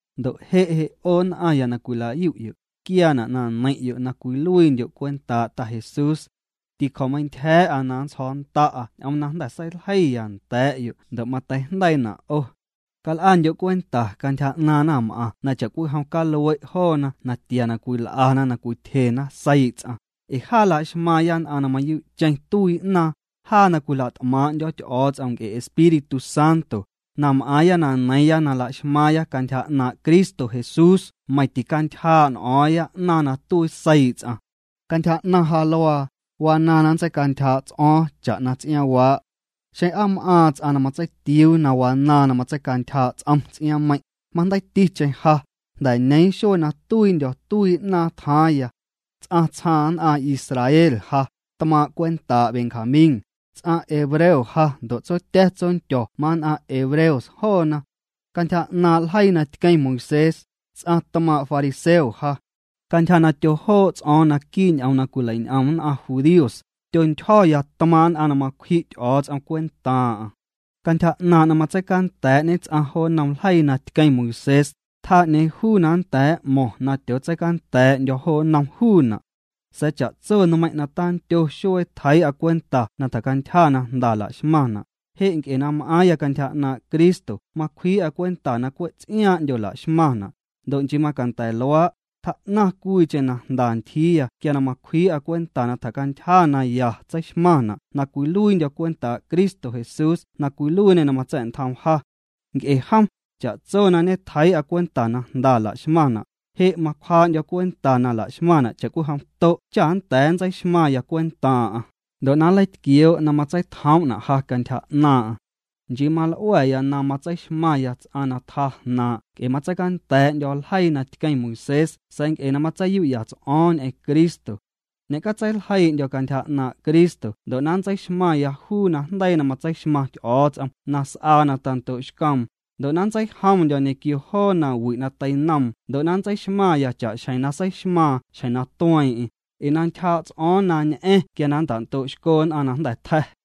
Ndo' je' je' 'o nn'aⁿya na cwila'yu'yo', quiaana' na neiⁿ'yo' na cwiluiindyo' cwentaa' Ta Jesús. Ticjo̱meintyja̱a̱'a na nntsjo̱o̱nnda'a ñ'oom na jnda̱ seiljeiya nda̱a̱'yo' ndo' mateijndeiina' 'o. Cal'andyo' cwenta cantyja 'naaⁿ naⁿm'aⁿ na cha'cwijom calue' joona natia na cwil'ana na cwityjena seii' ts'aⁿ, ee jaa laxmaaⁿya nn'aⁿ na mayuu'cheⁿ tuii 'naaⁿ, jaa na cwila't'maaⁿ'ndyo̱ Ty'o̱o̱ts'om nc'e Espíritu Santo, na m'aaⁿya na neiiⁿya na laxmaaⁿya cantyja 'naaⁿ' Cristo Jesús meiⁿ ticantyjaa' n'o̱o̱ⁿya 'naaⁿ na tuii seii' ts'aⁿ. Cantyja 'naⁿ ja luaa, wanaaⁿ na nntseicantyjaa' ts'o̱o̱ⁿ cha'na ts'iaaⁿwaa'. Xeⁿ aa m'aaⁿ ts'aⁿ na matseitiuu wanaaⁿ na matseicantyjaa' ts'om ts'iaaⁿmeiⁿ', majndeiiticheⁿ ja, jnda̱ ñeeⁿ xuee na tuiindyo̱ tuii 'naaⁿ tjaaⁿya. Ts'aⁿ tsjaaⁿ nn'aⁿ Israel ja, tmaaⁿ' cwentaa' Benjamín, ts'aⁿ hebreo ja ndo' tsotya̱ tsondyo̱ mann'aⁿ hebreos joona. Cantyja 'naaⁿ' ljeii na tqueⁿ Moisés, ts'aⁿ tmaaⁿ' fariseo ja. Cantyja na tyojoo' ts'o̱o̱ⁿ naquii' ñ'oom cwilein'om nn'aⁿ judíos, tyontyjo̱ya tmaaⁿ' nn'aⁿ na macwji' Ty'o̱o̱ts'om cwentaaⁿ'aⁿ. Cantyja 'naaⁿ' na matseicanda̱a̱'ñe ts'aⁿ jo nnom ljeii na tqueⁿ Moisés, tjaa 'ñeeⁿ juu na nnda̱a̱ m'mo̱ⁿ na tyootseicanda̱a̱'ndyo̱ jo nnom juuna'. Sa̱a̱ cha'tso nmeiⁿ' na tandyo xuee tjeii'a cwenta na tjacantyja na jnda laxmaⁿna', je' nc'e na m'aaⁿya cantyja 'naaⁿ' Cristo macwjii'a cwenta na cwe' ts'iaaⁿ'ndyo laxmaⁿna', ndo' nchii macanda̱ luaa', tjaa'naⁿ cwiicheⁿ na jnda ntyjiiya quia na macwjii'a cwenta na tjacantyja naya tseixmaⁿna' na cwiluiindyo̱ cwentaa' Cristo Jesús na cwiluiiñê na matsa̱'ntjoom ja. Nc'e jom, cha'tso na ñetjeii'a cwenta na jnda laxmaⁿna', je' macwjaa'ndyo̱ cwenta na laxmaⁿna' cha'cwijom to' cha nnda̱a̱ nntseixmaⁿya cwentaaⁿ'aⁿ, ndo' na nleitquioo' na matseitjoom'na' ja cantyja 'naaⁿ'aⁿ. Nchii mal'ua̱ya na matseixmaⁿya ts'aⁿ na tjaa jnaaⁿ' nc'e matseicanda̱a̱'ndyo̱ ljeii na tqueⁿ Moisés sa̱a̱ nc'e na matseiyu'ya ts'o̱o̱ⁿ ñ'eⁿ Cristo. Ñe'catseiljeii'ndyo̱ cantyja 'naaⁿ' Cristo ndo' na nntseixmaⁿya juu najndeii na matseixmaⁿ Ty'o̱o̱ts'om na s'aa na tando'xcoom, ndo' na nntseijomndyo̱ ñequio joo nawi' na teinoom ndo' na nntseixmaⁿya cha'xjeⁿ na seixmaaⁿ xjeⁿ na tueeⁿ'eⁿ, ee na ntyjaa' ts'o̱o̱ⁿ na ñ'a̱ⁿ quia na nnta'ndo'xco nn'aⁿ na jnda̱ tja̱.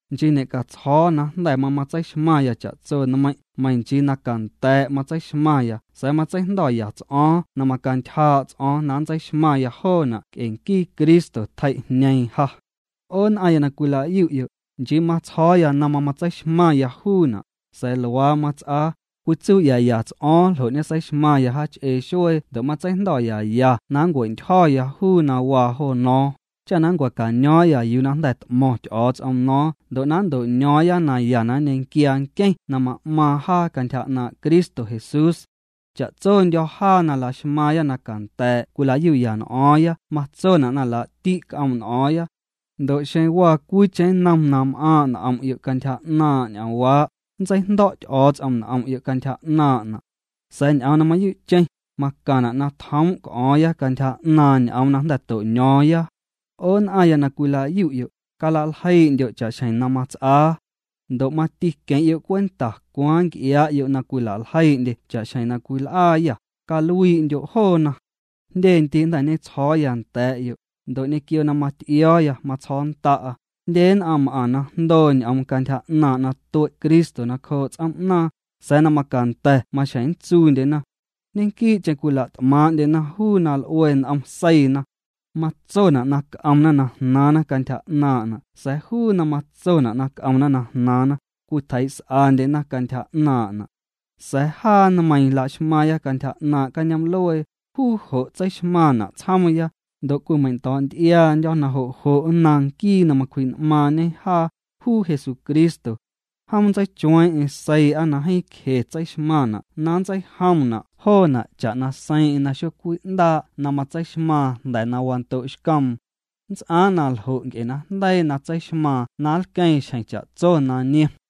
Nchii ñe'catsjo̱o̱ na jnda̱ mamatseixmaⁿya cha'tso nmeiⁿ' meiⁿ nchii na canda̱a̱' matseixmaⁿya sa̱a̱ matseijndo̱ya ts'o̱o̱ⁿ na macantyjaa' ts'o̱o̱ⁿ na ntseixmaⁿya joona' nc'e nquii Cristo tjei'jñeeⁿ ja. 'O nn'aⁿya na cwila'yu'yo', nchii matsjo̱o̱ya na mamatseixmaⁿya juuna', sa̱a̱ luaa mats'aa, cwitsuu'yaya ts'o̱o̱ⁿ ljo' ñeseixmaⁿya jaach'ee xuee ndo' matseijndo̱yaya na nncua̱'ntyjo̱ya juu na waa jo nno̱o̱ⁿ, cha nncua̱caño̱o̱ⁿya yuu na jnda̱ t'mo̱ⁿ Ty'o̱o̱ts'om no̱o̱ⁿ ndo' na nnto'ño̱o̱ⁿya naya na nñequiaa nqueⁿ na ma'maaⁿ jaa cantyja 'naaⁿ' Cristo Jesús. Cha'tsondyo̱ jaa na laxmaaⁿya na canda̱a̱' cwila'yu'ya n'o̱o̱ⁿya matsona' na laa'ti' c'oom' n'o̱o̱ⁿya. Ndo' xeⁿ waa cwiicheⁿ nnom na m'aaⁿ' n'om'yo' cantyja 'naaⁿ' ñ'oomwaa', nntseijndo̱' Ty'o̱o̱ts'om n'om'yo' cantyja 'naaⁿ'na'. Sa̱a̱ ñ'oom na mayuu'cheⁿ, macaⁿna' na tjoom' c'o̱o̱ⁿya cantyja 'naaⁿ ñ'oom na jnda̱ to'ño̱o̱ⁿya. 'O nn'aⁿya na cwila'yu'yo', cala'ljeii'ndyo' cha'xjeⁿ na mats'aa. Ndo' mati queⁿ'yo' cwenta cwaaⁿ nc'iaa'yo' na cwila'ljeii'ndye cha'xjeⁿ na cwil'aayâ, caluii'ndyo' joona. Jndye ndii' jnda̱ ñetsjo̱o̱ya nda̱a̱'yo', ndo' ñequio na mat'io̱o̱ya matsjo̱o̱nnda'a, jndye nn'aⁿ m'aⁿ na jndoo ñ'oom cantyja 'naaⁿ' na tue' Cristo nacjoo' ts'oom'naaⁿ, sa̱a̱ na macanda̱ maxjeⁿ nntsuundyena. Ñequii'cheⁿ cwila't'maaⁿ'ndyena juu na l'ue n'om seiina. Matsona' na c'omna na jnaaⁿna cantyja 'naaⁿ'na' sa̱a̱ juu na matsona' na c'omna na jnaaⁿna, cwitjeii's'andyena cantyja 'naaⁿ'na'. Sa̱a̱ jaa nmeiiⁿ la'xmaaⁿya cantyja 'naaⁿ' cañoom'luee, juu jo' tseixmaⁿna' tsjoomya, ndo' cwimeiⁿndo̱'nty'iaandyo̱ na jo' jo' nnaⁿ nquii na macwji'n'maaⁿñe jaa, juu Jesucristo. Jom nntseichueeⁿ'eⁿ seii'a na jeeⁿ cje tseixmaⁿna' na nntseijomna' joona' cha'na seiiⁿ'eⁿ na xocwi'ndaa' na matseixmaaⁿ jnda̱ na wando'xcoom. Nnts'aaⁿ na ljo' nc'e najndeii na tseixmaaⁿ na nlqueeⁿ xjeⁿ cha'tso na niom.